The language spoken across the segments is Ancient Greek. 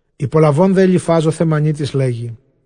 Ὑπολαβὼν δὲ Ἐλιφὰζ ὁ Θαιμανίτης, λέγει,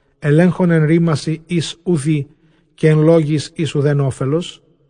ἐλέγχων ἐν ῥήμασιν οἷς οὐ δεῖ, καὶ ἐν λόγοις οἷς οὐδὲν ὄφελος;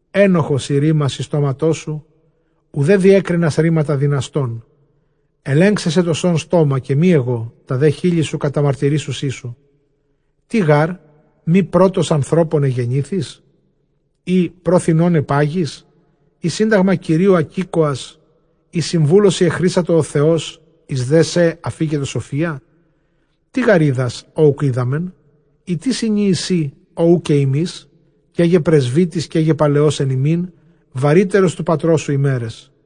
Ἔνοχος εἶ ῥήμασι στόματός σου, οὐδὲ διέκρινας ῥήματα δυναστῶν. Ἐλέγξαι σε τὸ σὸν στόμα καὶ μὴ ἐγὼ, τὰ δὲ χείλη σου καταμαρτυρήσουσι σου. Τί γάρ; μὴ πρῶτος ἀνθρώπων ἐγεννήθης; ἢ πρὸ θινῶν ἐπάγης; Ἢ σύνταγμα Κυρίου ἀκήκοας; ἢ συμβούλῳ σοι ἐχρήσατο ὁ Θεός; εἰς δέ σε ἀφίκετο σοφία; Τί γὰρ οἶδας, ὃ οὐκ οἴδαμεν; ἢ τί συνίεις σὺ, ὃ οὐ καὶ ἡμεῖς; Καί γε πρεσβύτης καί γε παλαιὸς ἐν ἡμῖν, βαρύτερος τοῦ πατρός σου ἡμέραις.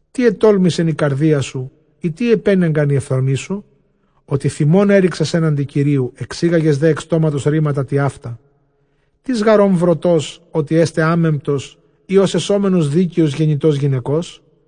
Τί ἐτόλμησεν ἡ καρδία σου; ἢ τί ἐπήνεγκαν οἱ ὀφθαλμοί σου, ὅτι θυμὸν ἔῤῥηξας ἔναντι Κυρίου, ἐξήγαγες δὲ ἐκ στόματος ῥήματα τοιαῦτα; Τίς γὰρ ὢν βροτὸς, ὅτι ἔσται ἅμεμπτος; ἢ ὡς ἐσόμενος δίκαιος γεννητὸς γυναικός;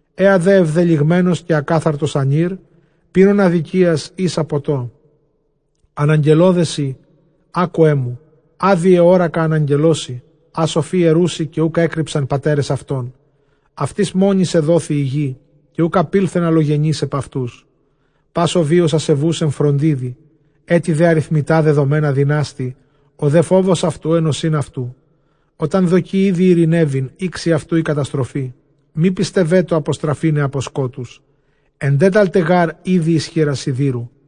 Ἔα δὲ ἐβδελυγμένος καὶ ἀκάθαρτος ἀνὴρ, πίνων ἀδικίας ἶσα ποτῷ. Ἀναγγελῶ δέ σοι, ἄκουέ μου, ἃ δὴ ἑώρακα, ἀναγγελῶ σοι, ἃ σοφοὶ ἐροῦσι, καὶ οὐκ ἔκρυψαν πατέρες αὐτῶν. Αὐτοῖς μόνοις ἐδόθη ἡ γῆ, καὶ οὐκ ἐπῆλθεν ἀλλογενὴς ἐπʼ αὐτούς. Πᾶς ὁ βίος ἀσεβοῦς ἐν φροντίδι, ἔτη δὲ ἀριθμητὰ δεδομένα δυνάστῃ. Ὁ δὲ φόβος αὐτοῦ ἐν ὠσὶν αὐτοῦ· ὅταν δοκῇ ἤδη εἰρηνεύειν, ἥξει αὐτοῦ ἡ καταστροφή. Μὴ πιστευέτω ἀποστραφῆναι ἀπὸ σκότους, ἐντέταλται γὰρ ἤδη εἰς χεῖρας σιδήρου,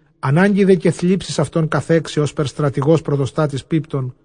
ἀνάγκη δὲ καὶ θλίψις αὐτὸν καθέξει, ὥσπερ στρατηγὸς πρωτοστάτης πίπτων·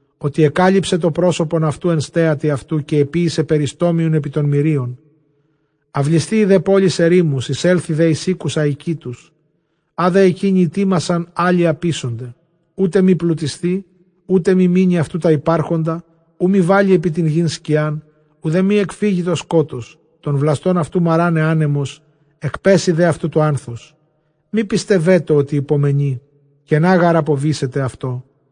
Ὅτι ἐκάλυψε τὸ πρόσωπον αὐτοῦ ἐν στέατι αὐτοῦ, καὶ ἐποίησε περιστόμιον ἐπὶ τῶν μηρίων. Αὐλισθείη δὲ πόλεις ἐρήμους, εἰσέλθοι δὲ εἰς οἴκους ἀοικήτους· ἃ δὲ ἐκεῖνοι ἡτοίμασαν, ἄλλοι ἀποίσονται. Οὔτε μὴ πλουτισθῇ, οὔτε μὴ μείνῃ αὐτοῦ τὰ ὑπάρχοντα· οὐ μὴ βάλῃ ἐπὶ τὴν γῆν σκιὰν, οὐδὲ μὴ ἐκφύγῃ τὸ σκότος· τὸν βλαστὸν αὐτοῦ μαράναι ἄνεμος, ἐκπέσοι δὲ αὐτοῦ τὸ ἄνθος. Μὴ πιστευέτω ὅτι ὑπομενεῖ, κενὰ γὰρ ἀποβήσεται αὐτῷ.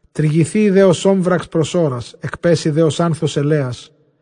Τρυγηθείη δὲ ὡς ὄμφαξ πρὸ ὥρας, ἐκπέσοι δὲ ὡς ἄνθος ἐλαίας.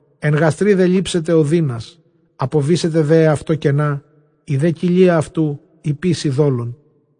Ἐν γαστρὶ δὲ λήψεται ὀδύνας, ἀποβήσεται δὲ αὐτῷ κενὰ, ἡ δὲ κοιλία αὐτοῦ ὑποίσει δόλον.